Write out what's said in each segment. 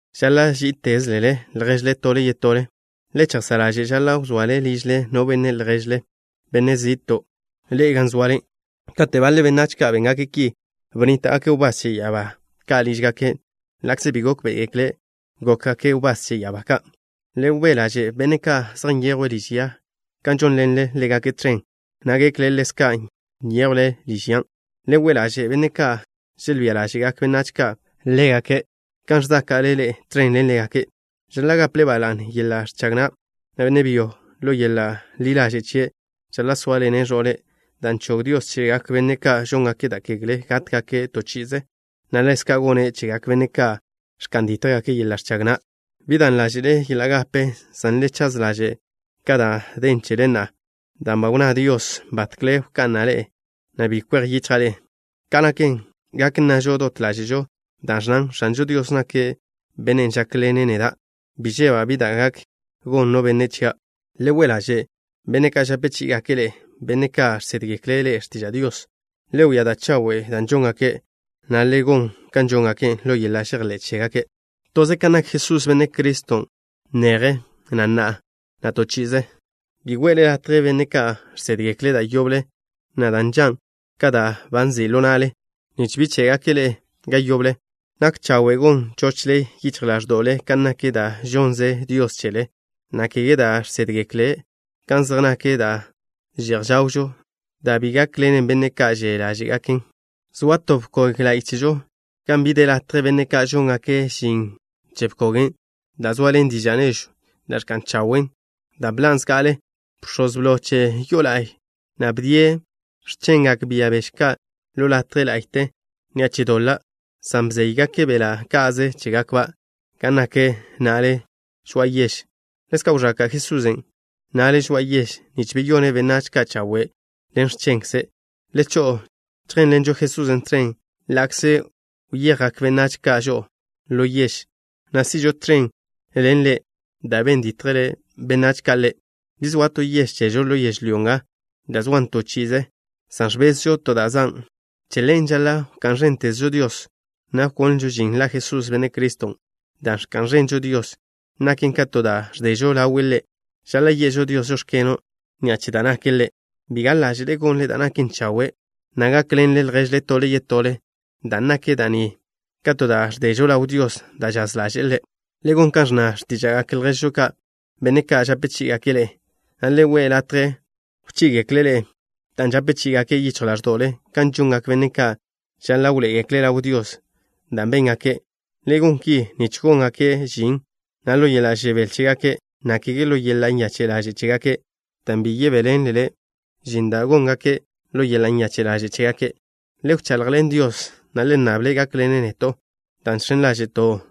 Žaḻa' ží'itezlele lježle tole yetole. Le chejsá' ḻaže' žaḻa' wzoale ližle no benne' lježle, benne' zi'ton' ḻe'e gan zoale. Kate' baḻe benách ka' béngake' ki, bnníta'gake' wbás che ya'abá ka' lížgake', ḻa'kze bi gókbe'egekle' gókgake' wbás che ya'abá ka'. Le we' ḻaže' benne' ka' zej nyejwe' liž ya ka žónḻenle ḻégake' tẕen, na' gekle ḻezka' nyéjwle liž yan'. Le we' ḻaže' benne' ka' želbía ḻáže'gak benách ka' ḻégake', kan ẕzáka'le ḻe'e tẕen ḻen ḻégake'. Žaḻa' gaple ba la'ne yeḻa' ẕchag na', na' benne' byo ḻo yeḻa' ḻi ḻaže' chie' žaḻa' sóaḻene' ẕo'le', dan' chog Dios chegak benne' ka' žóngake' da' kegle gátgake' to chi'ize, na' ḻezka' gone' chegak benne' ka' ẕka'n dítjgake' yeḻa' ẕchag na'. Bi dan ḻáže'le yeḻa' gape, san le chaz ḻaže' ka da' den chele na'a, dan' ba wnná Dios: “Batkle wka'na' le', na' bi kwej yichja' le'.” Ka' naken, gak nnažo dot ḻáže'žo dan' ẕnnan: X̱anžo Dios nake' Bennen' žákḻene' neda'. Bi žeba' bi da' gak gon no benne' chia'. Le we' ḻaže' benne' ka' žape chí'igake' ḻe'e, benne' ka' žsédgekle' ḻe'e x̱tiža' Dios. Le wia da' chawe' da' žóngake', na' le gon kan žóngake' ḻo yeḻa' žejḻé' chégake'. Toze kan nak Jesús, Benne' Criston', neje, na' na'a, na' to chi'ize. Bi we'le latje benne' ka' žsédgekle' da' yoble, na' da' nžan' ka da' ba nzi' ḻo na'le, nich bi ché'gake' ḻe'e ga yoble. Nak chawe' gon chochle yichj ḻáẕdo'le kan nak da' žonnze Dios chele, na' kege da' žsédgekle' kan zej nak da' že'j žawžo, da' bi gákḻenen benne' ka' že' ḻáže'gaken'. Zoa to bkog la'y chežo, gan bi de latje benne' ka' žóngake' žin che bkogen' da' zoaḻen diža' nežwn' da' ẕka'n chawe' dan' bḻan' zga'ale. Bx̱oz blo che yo'o la'y na' bdie' x̱chengak bia beže ka' ḻo latje ḻa'yte ni'a che doḻa', san bzéygake' beḻa' ka'ze chégakba' gan nak na'le žoa'a yež. Ḻezka' wẕaka' Jesusen' na'le žoa'a yež nich beyone' benách ka' chawe' ḻen x̱chenkze'. Le cho'o chjénḻenžo Jesusen' tẕen, ḻa'kze kwejgak benách ka' žo'o ḻo yež, na' si'žo tẕen ḻen Ḻe' dan' ben dítjgekle benách ka' Ḻe'. Bi zoa to yež chežo ḻo yežlyó nga da' zoan to chi'ize, san ẕbezžo to da' zan'. Che ḻen, žaḻa' wká'n ẕéntezžo Dios, na' wkonlžo žin la Jesús, Benne' Criston'. Da' ẕka'n ẕenžo Dios naken ka to da' ẕdežo ḻawe' Ḻe'. Žaḻa' ye'žo Dios: “Žóx̱keno'” ni'a che da' nake' Ḻe'. Bi gaḻ ḻaže' gonle da' naken chawe', na' gákḻenle lježle tole yetole, dan' nak da' ni ka to da' ẕdežo ḻaw Dios da' žaz ḻaže'e Ḻe'. Le gon kan ẕnna x̱tíža'gak lježžo ka', benne' ka' žape chí'igake' ḻe'e, na' le we' latje wchí'igekle' ḻe'e, dan' žape chí'igake' yichj ḻáẕdo'le, kan žongak benne' ka' žaḻa' wḻoé'egekle' ḻaw Dios da' béngake'. Le gon ki nich góngake' žin na' ḻo yeḻa' žebél chégake', na' kege ḻo yeḻa' nyache' ḻaže' chégake', dan' bi yebéḻenlele žin da' góngake' ḻo yeḻa' nyache' ḻaže' chégake'. Le wchaḻjḻen Dios, na' le nnable' gákḻene' neto', dan' žx̱en ḻáže'to'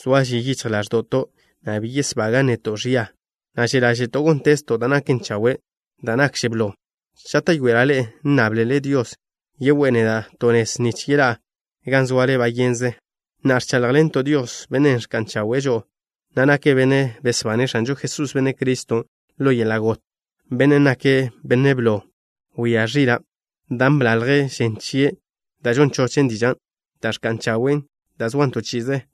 soa ži yichj ḻáẕdo'to', na' bi yesbagan' neto' ẕia, na' že' ḻáže'to' góntezto' da' naken chawe'. Da' nakže blo, žáta'yoela' ḻe'e nnáblele Dios yegoé'e neda' to nez nich yeḻá'a gan zoale bayenže. Na'a, ẕcháḻjḻento' Dios, Bennen' ẕka'n chawe'e žo'o, na' nake' Bennen' besbane' X̱anžo Jesús, Benne' Criston' ḻo yeḻa' got, Bennen' nake' Benne' Blo Wia Ẕila', dan' bḻalje' žen chie', da' žon chochen dižan' da' ẕka'n chawen', da' zoan to chi'ize.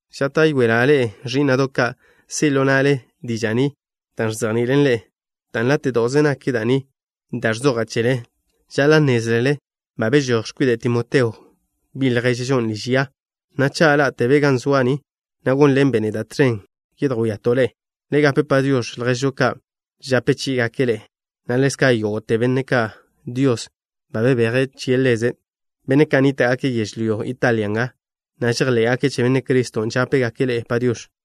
Žáta'yoela' ḻe'e, ẕí'na'do' ka', si' ḻo na'le diža' ni da' ẕzejni'ilen ḻe'e, dan' láte'do'ze nak da' ni da' ẕzoja' chele. Žaḻa' nnézlele ba bežój x̱kwide' Timoteo, bi' lježžon', liž ya, na' cha' ḻá'tebe' ga zoa' ni, na' gónḻenbe' neda' tẕen yedjwíato' ḻe'e. Le gape “Padiox̱” lježžo ka' žape chí'igake' ḻe'e, na' ḻezka' yógo'te benne' ka' Dios ba bebeje' che Ḻeze'. Benne' ka' nníta'gake' yežlyó Italia nga, na' žejḻé'gake' che Benne' Criston', žápegake' ḻe'e “Padiox̱.”